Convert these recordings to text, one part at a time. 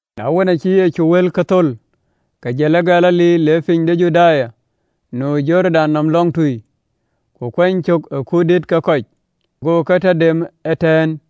Na wën, aacï Yecu wëlkë thöl, ke jël ë Galili, le piny de Juda nu ë Jordan nɔm lɔŋtui. Ku aa kuany cök ë kuut dït ke kɔc, go ke tɔ dem ëtɛ̈ɛ̈n.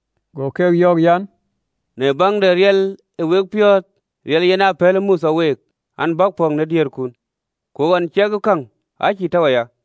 Go ke yɔ̈ɔ̈k an, “Në baŋ de riɛl aa we piɔ̈ɔ̈th riɛl, yen aa pɛ̈lë Mothe week an, bäk pɔ̈k në diëërkun, ku ɣɔn ciɛk ë käŋ, aa cïï tɔ̈u aya.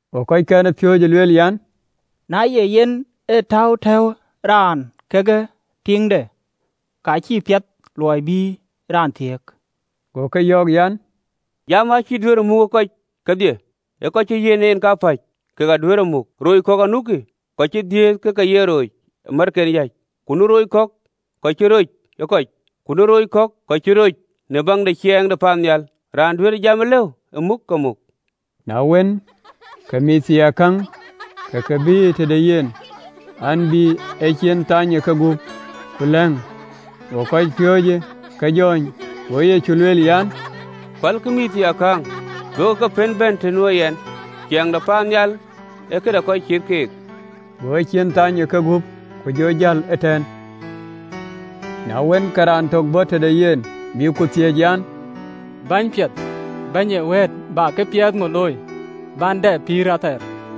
Go kɔckɛn ë piööcë yen yɔ̈ɔ̈k an, “Na ye yen ee täu tɔ̈uwë raan kekë tiiŋde ka, ka acïï piɛth luɔi bï raan thiëëk.” Go ke yɔ̈ɔ̈k an, “Jamë acï duëërë muk ë kɔc kedhie, ee kɔc cï ë Nhialic yiɛ̈n en kapäc, keek aduëër e muk. Rooc kɔ̈k anukï, kɔc cï dhiëëth ke ke ye rooc ë märken yäc, ku nu rooc kɔ̈k, kɔc cï roc ë kɔc, ku nu rooc, kɔc cï röt roc në biäk de ciɛɛŋ de paannhial. Raan duëër jamë lëu ë muk, ke muk.” Na wën, ke mïththiaakäŋ ke ke bïïyë tëde yen an, bï ecin thany ë kegup, ku lɛ̈ŋ: go kɔcpiööcë ke jɔ̈ɔ̈ny. Go Yecu lueel an, “Pälkï mïththiaakäŋ, duökï ke pën bɛ̈n të nuö yɛn, ciɛɛŋ de paannhial ee këde kɔc cït keek.” Go ecin thany ë kegup, ku jɔ jäl ëtɛ̈ɛ̈n. Na wën, ke raan tök bɔ̈ tëde yen, bï ku thiëëc an, “Bɛ̈ny piɛth bɛ̈ny ee wëët, bä këpiɛth ŋö looi, bän dɛ pïïr athɛɛr?”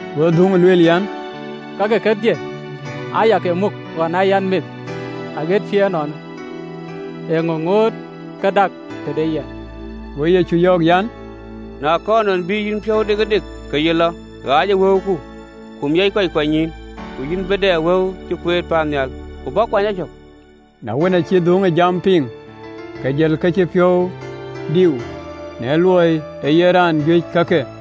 Go dhuŋë lueel an, “Kake kedhie aa ya ke muk ɣɔn aa yɛn meth aɣët cï ënɔɔnë, eeŋö ŋoot ke dak tëde yɛn?” Go Yecu yɔ̈ɔ̈k an, “Na kɔɔr nɔn bï yïn piɔ̈u dikëdik, ke yï lɔ, ɣaacë wëuku, ku miɔc kɔc kuanynyïïn, ku yïn bï dɛ wëu cï kueet paannhial, ku bä kuany a cök.” Na wën, aacï ee dhuŋë jamë piŋ, ke jël, ke cï piɔ̈u diu, në luɔi ee yen raan juëc ë kake.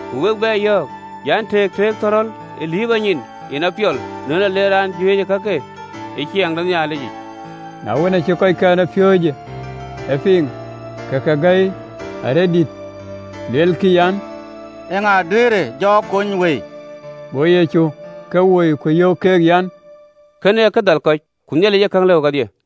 Ku wek bɛ yɔ̈ɔ̈k an, “Tëëk tëëkë thɔ̈rɔ̈l ë liiprɔ nyin, yen apiɔl në lɔ de raan de kajuëc ë Ciɛɛŋ de Nhialic yic.” Na wën, aacï kɔckɛn ë piööcë e piŋ, ke ke gäi aläl, luelkï an, “Eeŋa duëërë ja kony wëi?” Go Yecu ke woi, ku yöök keek an, “Kënë ee kë dhal kɔc: ku Nhialic ee käŋ lëu kedhie.”